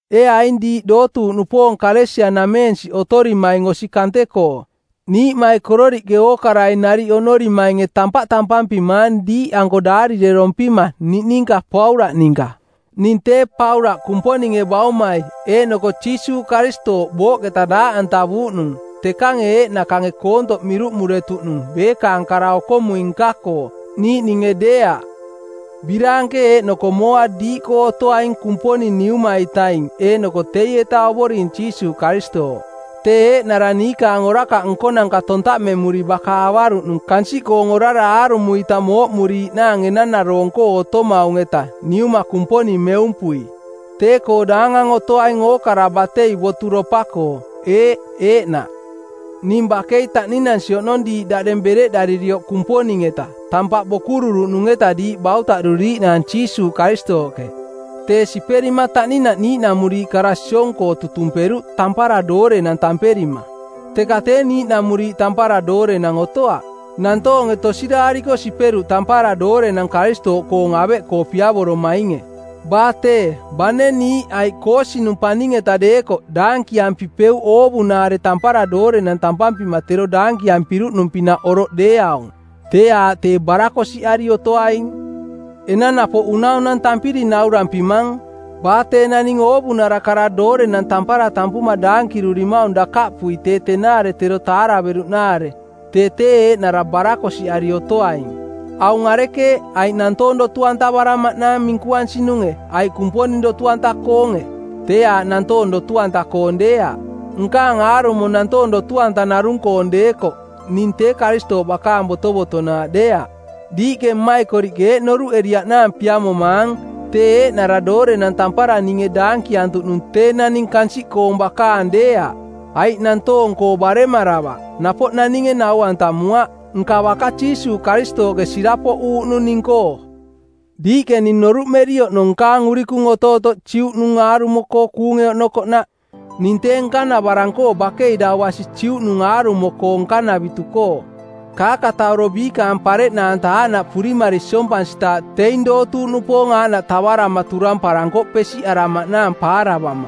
Ee aing diiꞌ dootuuꞌnupoong Kalesia-nameensiꞌ otorimaing osi kante-koo, niiꞌmaikororiꞌke ookarai nariꞌ oꞌnorimainge tampaꞌ tampampimaang diiꞌanko daarirerompima niꞌninka Paulaꞌ ninka; Ning tee Paulaꞌ Kumponinge Baumai eeꞌnoko Jiisuuꞌ Karistooꞌ booꞌketa daaꞌantavuuꞌnung, tekange eeꞌnakange koontoꞌ miruꞌmuretuꞌnung beekaang kara okomui nka-koo, niiꞌninge deeaꞌ. Biraanke eeꞌnoko mooa diiꞌkoo otoaing Kumponing Niuma-itaing eeꞌnoko teieta Ovoring Jiisuuꞌ Karistooꞌ. Tee eeꞌnara niikaang orakaꞌ nkonanka tontaꞌmemuri baka avaruꞌnung kansiꞌkoong orara aarumo-ita mooꞌmuriiꞌnaang enanaroong-koo otomaung-eta Niuma Kumponing meumpui. Tee-koo daangang otoaing ookara batei boturopa-koo. Eeꞌ, eeꞌnaꞌ. Ning bakei taꞌninansi oꞌnong diiꞌ daꞌdeng bereꞌdaririoꞌ Kumponing-eta, tampaꞌ bokururuꞌnung-eta diiꞌ bautaꞌduriiꞌnaang Jiisuuꞌ Karistooꞌke. Tee siperima taꞌninaꞌ niiꞌnamuriiꞌ kara siong-koo tutumperuꞌ “tampara doorenang” tamperima. Teka tee niiꞌnamuriiꞌ tampara doorenang otoaꞌ. Nantoonge tosiraariko siperuꞌ tampara doorenang Karistooꞌkoong aveꞌkoo piavoromainge. Baa tee, bane niiꞌ aiꞌ koosinung˜ paning-eta deekoꞌ daankiampipeuꞌ oovunaare “tampara doorenang” tampampima tero daankiampiruꞌnung-pinaꞌ oroꞌ deeaung, tee aaꞌ tee barakosiꞌari otoaing. Enang napoꞌ unaunantampiri naurampimang: Baa tee naning oovunara kara “doorenang tampara” tampuma daankirurimaung dakaꞌpui tee tenaare tero taaraveruꞌnaare, tee tee eeꞌnara barakosiꞌari otoaing. Aung arekeeꞌ, aiꞌ nantoong dotu-antavaramaꞌnaang minkuansinunge aiꞌ Kumponing dotu-anta-koonge? Tee aaꞌ nantoong dotu-anta-koong deeaꞌ. Nkaang aarumo nantoong dotu-anta narung-koong deekoꞌ ning tee Karistooꞌ bakaang botovotonaaꞌ deeaꞌ. Diiꞌke mmaikoriꞌke eeꞌ noruꞌeriiꞌnaang piamomaang tee eeꞌnara doorenang tampara ninge daankiantuꞌnung tee naning kansiꞌkoong bakaang deeaꞌ. Aiꞌ nantoong-koo baremaravaꞌ, napoꞌ naninge nau-antamuaꞌ, nka baka Jiisuuꞌ Karistooꞌke sirapoꞌuuꞌnung ning-koo. Diiꞌke ning noruꞌmeri oꞌnong nkaang urikung otootoꞌ Juꞌnung aarumo-koo kuunge oꞌnokoꞌnaꞌ; Ning tee nkanavarang-koo bakei dau basi Juꞌnung aarumo-koo nkanavitu-koo. Kaakatauro biikaang pareꞌnaanta aaꞌnaꞌ purimari siompansitaaꞌ teing dootuuꞌnupoong aaꞌnaꞌ tavarama turamparankoꞌ pesiꞌaramaꞌnaang paaravama;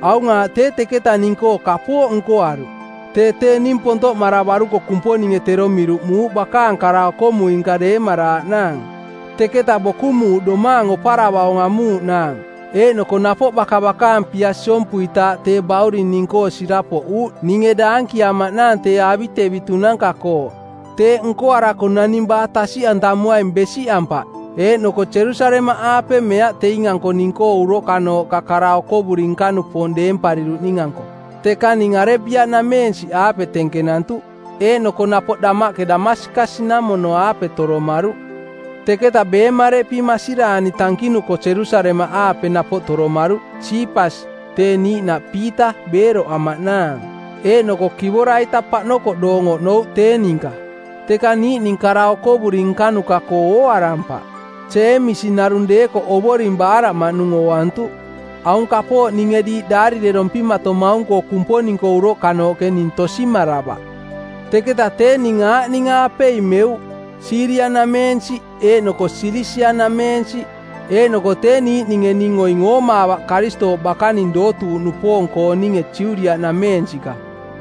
Aung aaꞌ tee teketa ning-koo kapooꞌ nkoaruꞌ: Tee tee ning pontoꞌmaravaruko Kumponinge tero miruꞌmuuꞌ bakaang kara-okomui-nka deemaraaꞌnaang; Teketa bokumuuꞌ domaang oparavaung amuuꞌnaang, eeꞌnoko napoꞌ baka bakaang pia siompuitaaꞌ tee Bauring ning-koo sirapoꞌuuꞌ ninge daankiamaꞌnaang tee avitevitunanka-koo; Teeꞌ nkoarako naning baa tasiꞌantamuaing besiꞌampaꞌ eeꞌnoko Jerusalemaꞌaape meaꞌ teing-anko ning-koo uroꞌkanooꞌka kara-okovuri nka-nupoong deempariruꞌning-anko, teka ning Arebia-nameensiꞌaape tenkenantuꞌ. Eeꞌnoko napoꞌ damaꞌke Damaskas-namono-aape toromaruꞌ. Teketa beemareꞌpi masiraani tankinuko Jerusalemaꞌaape napoꞌ toromaruꞌ Siipas, tee niiꞌnaꞌ Piita, beeroꞌamaꞌnaang, eeꞌnoko kivora-ita paꞌnokoꞌ doong oꞌnouꞌ tee ninka. Teka niiꞌning kara okovuri nkanuka-koo ooarampaꞌ, Jeemisi narung deekoꞌ Ovoring baaraꞌmaꞌnung ooantuꞌ. (Aung kapooꞌ ninge diiꞌ daarirerompimatomaung-koo Kumponing-koo uroꞌkanooꞌke ning tosimaravaꞌ.) Teketa tee ning aaꞌning-aapei meuꞌ: Siiria-nameensiꞌ eeꞌnoko Silisia-nameensiꞌ. Eeꞌnoko tee niiꞌninge ning oing oomaavaꞌ Karistooꞌ bakaning dootuuꞌnupoong-kooninge Judiaꞌnameensiꞌka.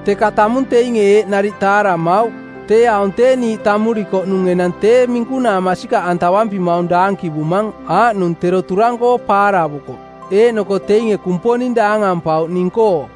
Teka tamung teinge eeꞌ nariꞌ taaramauꞌ: “Tee aung tee niiꞌ tamurikoꞌnung enang tee minkunaa masikaꞌantavampimaung daankivumang aaꞌnung tero turang-koo paaravukoꞌ.” Eeꞌnoko teinge Kumponing daangampauꞌ ning-koo.